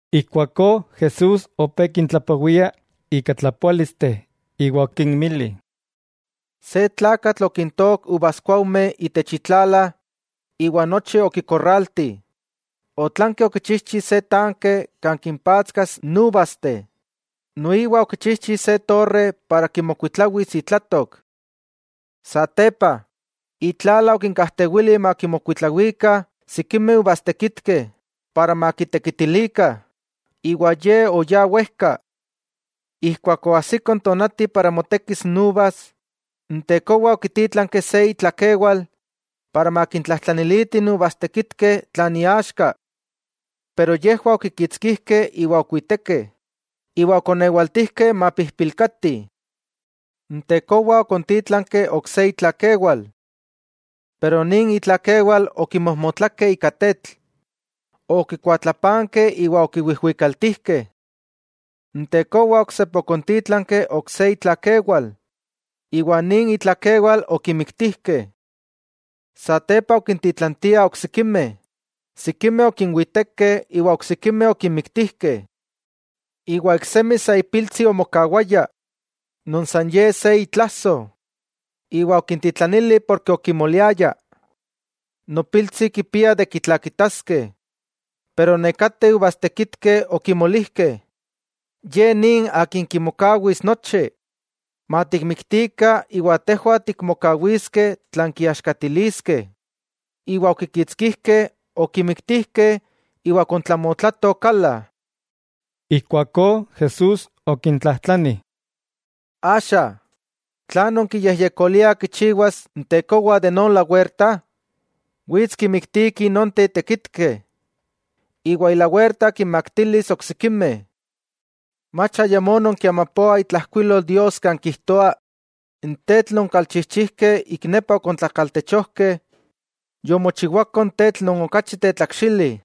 Ijkuakó Jesús opé kintlapowia ika tlapoálisteh iwa okinmili: —Se tlakatl okintojtook uvaskuaujmeh itech itlala iwa nochi okitsatsak. Otlanki okichijchi se tanke kan kimpatskas n uvasteh noiwa okichijchi se torre para kimokuitlawis itlatok. 'Satepa, itlala okinkajtewili makimokuitlawikah sikimeh uvastekitkeh para makitekitilikah, iwa oyá wejka. Ijkuak oajsiko n tonati para motekis n uvas, n tekowa okitítlanki se itlakewal para makintlajtlaniliti n uvastekitkeh tlan iaxka. Pero yejwah okikitskijkeh iwa okiwitekeh, iwa okonewaltijkeh mapijpilkati. N tekowa okontítlanki ok se itlakewal. Pero nin itlakewal okimojmotlakeh ika tetl, okikuatlapankeh iwa okiwijwikaltijkeh. N tekowa oksepa okontítlanki ok se itlakewal, iwa nin itlakewal okimiktijkeh. Satepa okintitlantiah oksikimeh, sikimeh okinwitekeh iwa oksikimeh okinmiktijkeh. 'Iwa iksemi sa ipiltsi omokawaya, non san ye se itlasoj, iwa okintitlanili porke okimoliaya: “Nopiltsi, kema kitlakitaskeh.” Pero nekateh uvastekitkeh okimolijkeh: “Ye ni akin kimokawis nochi; matikmiktikah iwa tejwah tikmokawiskeh tlan kiaxkatiliskeh.” Iwa okikitskijkeh, okimiktijkeh iwa okontlamotlatoh kala. Ijkuakó Jesús okintlajtlani: —Axa ¿tlan nonkiyejyekoliah kichiwas n tekowa de non lawerta? Wits kinmiktiki nonteh tekitkeh, iwa ilawerta kinmaktilis oksikimeh. 'Mach ayamó nonkiamapoah itlajkuilol Dios kan kijtoa: N tetl non kalchijchijkeh ik nepa okontlakaltechojkeh, yomochiwako n tetl non okachi tetlakxili.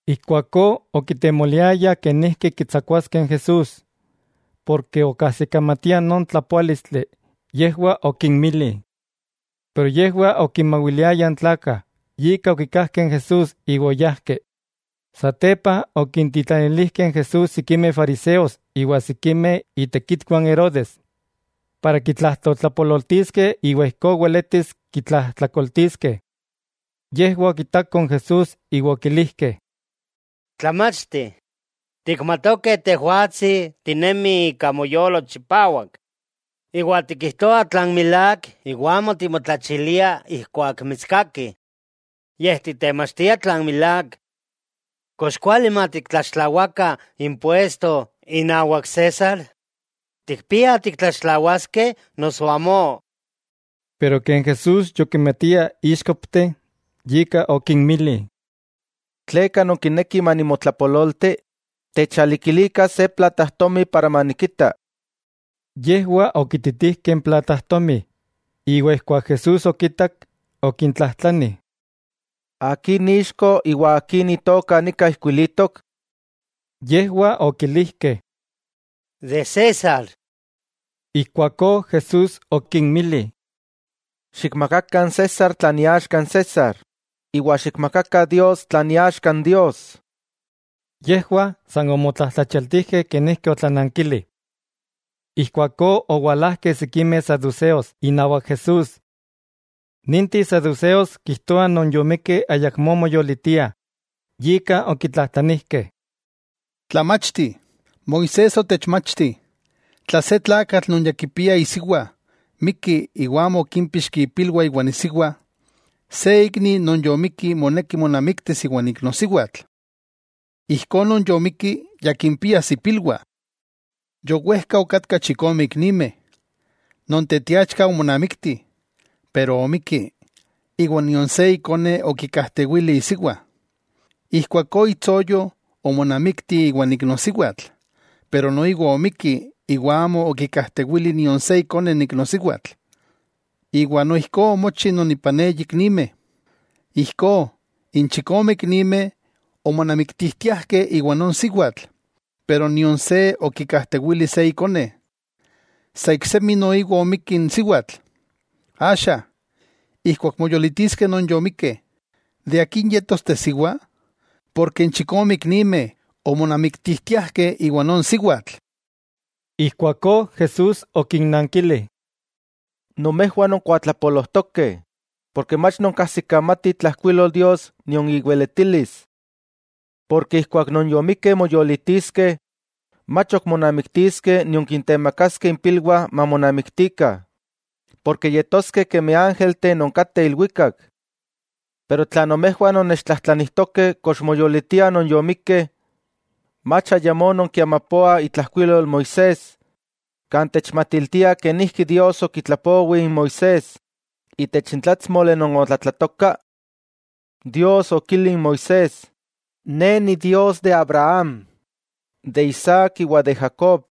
Ijkuakó okitemoliayah kenijki kitsakuaskeh n Jesús, porke okajsikamatiah non tlapoálistli yejwah okinmili. Pero yejwah okinmawiliayah n tlakah, yika okikajkeh n Jesús iwa oyajkeh. Satepa okintitlanilijkeh n Jesús sikimeh fariseos iwa sikimeh itekitwah n Herodes, para kitlajtoltlapololtiskeh iwa ijkó weletis kitlajtlakoltiskeh. Yejwah okitakoh n Jesús iwa okilijkeh: —Tlamachti, tikmatokeh Tejwatsi tinemi ika moyolo chipawak iwa tikijtoa tlan milák iwa amo timotlachilia ijkuak mitskakih, yej titemachtia tlan milák. ¿Kox kuali matiktlaxtlawakah impuesto inawak César? ¿Tikpiah tiktlaxtlawaskeh noso amó? Pero ken Jesús yokimatia íxkopteh, yika okinmili: —¿Tleka nonkinekih manimotlapololti? Techalikilikah se platajtomi manikita. Yejwah okititijkeh n platajtomi, iwa ijkuak Jesús okitak, okintlajtlani: —¿Akin ixko iwa akin itoka nika ijkuilitok? Yejwah okilijkeh: —De César. Ijkuakó Jesús okinmili: —Xikmakakah n César tlan iaxka n César, iwa xikmakakah Dios tlan iaxka n Dios. Yejwah san omotlajtlachialtijkeh kenijki otlanankili. Ijkuakó owalajkeh sikimeh saduseos inawak Jesús. Ninteh saduseos kijtoah non yomikkeh ayakmó moyolitiah, yika okitlajtlanijkeh: —Tlamachti, Moisés otechmachtih, tla se tlakatl non ya kipia isiwa mikki, iwa amo okímpixki ipilwah iwan isiwa, se ikni moneki monamiktis iwan iknosiwatl. Ijkó non yomikki ya kimpias ipilwah. Yowejka okatkah chikome iknimeh. Non teteachka omonamikti pero omikki iwa nion se ikone okikajtewili isiwa. Ijkuakó itsoyo omonamikti iwan iknosiwatl, pero noiwa omikki iwa amo okikajtewili nion se ikone n iknosiwatl, iwa noijkó omochi non ipan eyi iknimeh. Ijkó n chikome iknimeh omonamiktijtiajkeh iwa non siwatl, pero nion se okikajtewili se ikone. Sa iksemi noiwa omikki n siwatl. Axa, ijkuak moyolitiskeh non yomikeh, ¿de akin yetos tesiwa?, porke n chikome iknimeh omonamiktijtiajkeh iwa non siwatl. Ijkuakó Jesús okinnankili: —Nomejwah nonkuatlapolojtokeh, porke mach nonkajsikamatih itlajkuilol Dios nion iweletilis. Porke ijkuak non yomikeh moyolitiskeh, mach ok monamiktiskeh nion kintemakaskeh impilwah mamonamiktikah, porke yetoskeh kemi ángelteh non kateh ilwikak. Pero tla nomejwah nonnechtlajtlanijtokeh kox moyolitiah non yomikkeh, ¿mach ayamó nonkiamapoah itlajkuilol Moisés, kan techmatiltia kenijki Dios okitlapowi n Moisés itech n tlátsmoli non otlatlatoka? Dios okili n Moisés: “Ne Idios Abraham, Isaac, iwa Jacob.”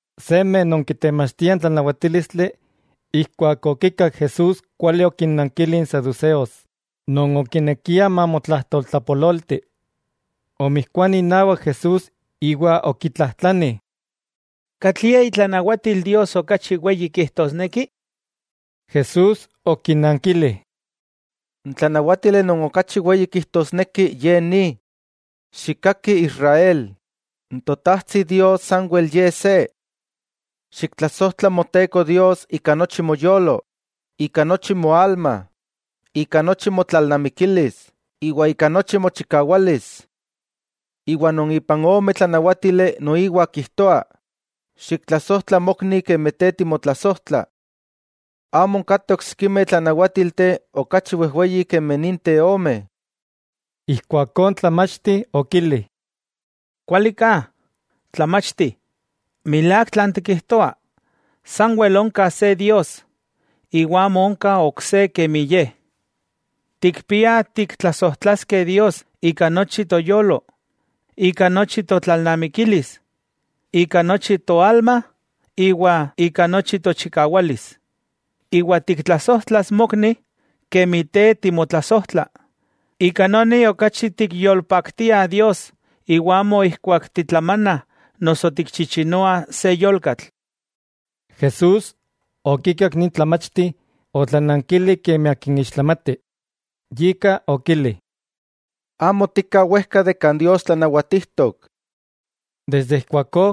Seme non kitemachtia n tlanawatílistli, keman okikak Jesús kuali okinnankili n saduseos non okinekia mamotlajtoltlapololti. Omijkuani inawak Jesús iwa okitlajtlani: —¿Katlie itlanawatil Dios okachi weyi kijtosneki? Jesús okinankili: —N tlanawátili non okachi weyi kijtosneki, ye ni: “Xikkaki Israel, n Totajtsi Dios sanwel Ye se.” “Xiktlasojtla Moteko Dios ika nochi moyolo, ika nochi moalma, ika nochi motlalnamikilis iwa ika nochi mochikawalis.” Iwa non ipan ome tlanáwatili noiwa kijtoa: “Xiktlasojtla mokni kemi te timotlasojtla.” Amo onkateh oksikimeh tlanawátilteh okachi wejweyih kemi ninteh ome. Ijkuakó n tlamachti okili: —Kuali ka, Tlamachti. Milák tlan tikijtoa: Sanwel onka se Dios, iwa amo onka ok se kemi Ye. Tikpiah tiktlasojtlaskeh Dios ika nochi toyolo, ika nochi totlalnamikilis, ika nochi toalma iwa ika nochi tochikawalis, iwa tiktlasojtlas mokni, kemi te timotlasojtla, ika noni okachi tikyolpaktiah Dios iwa amo ijkuak titlamanah noso tikchichinoah se yolkatl. Jesús okikak nin tlamachti otlanankili kemi akin ixtlamati, yika okili: —Te amo tika wejka kan Dios tlanawatijtok. Ijkuakó,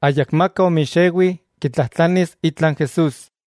ayakmaka omixewi kitlajtlanis itla n Jesús.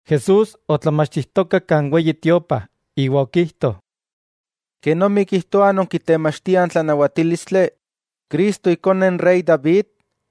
Jesús otlamachtijtoka kan Weyi Tiopa iwa okijto: —¿Kenomi kijtoah non kitemachtiah n tlanawatílistli, Cristo Ikone n rey David?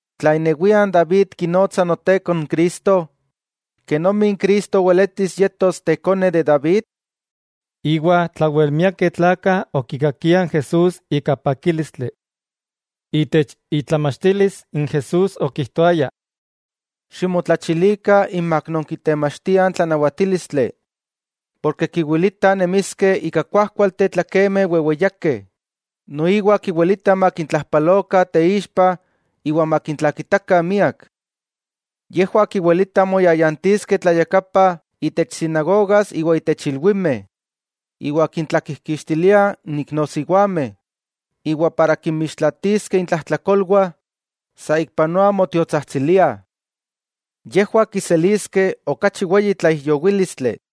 Tla inewia n David kinotsa Noteko n Cristo, ¿kenomi n Cristo weletis yetos ikone n David? Iwa tlawelmiakeh tlakah okikakiah n Jesús ika pakílistli. Itech itlamachtilis n Jesús okijtoaya: —Ximotlachilikah inmak non kitemachtiah n tlanawatílistli, porke kiwilitah nemiskeh ika kuajkualteh tlakemeh weweyakeh, noiwa kiwilitah makintlajpalokah teixpa iwa makintlakitakah miak. Yejwah kiwilitah moyayantiskeh tlayakapa itech sinagogas iwa itech ilwimeh, iwa kintlakijkixtiliah n iknosiwameh, iwa para kinmixtlaatiskeh intlajtlakolwah saikpanoa motiotsajtsiliah. Yejwah kiseliskeh okachi weyi tlaijyowílistli.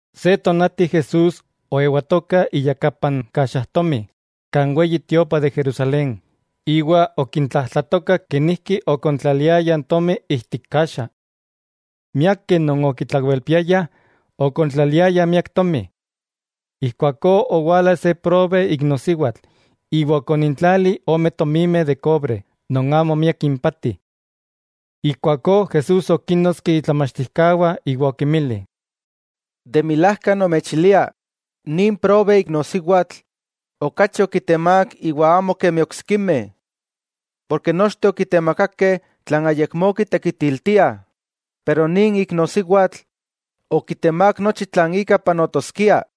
Se tonati Jesús oewatoka iyakapa n kaxajtomi kan Weyi Tiopa de Jerusalén, iwa okintlajtlatoka kenijki okontlaliayah tomi ijtik kaxa. Miakeh non okitlawelpiayah, okontlaliayah miak tomi. Ijkuakó owala se probe iknosiwatl iwa okonintlali ome tomimeh de kobre, non amo miak impati. Ijkuakó Jesús okínnotski itlamachtijkawah iwa okinmili: —De milajka nomechilia, nin probe iknosiwatl, okachi okitemák iwa amo kemi oksikimeh. Porke nochteh okitemakakeh tlan ayakmó kitekitiltiah, pero nin iknosiwatl, okitemák nochi tlan ika panotoskia.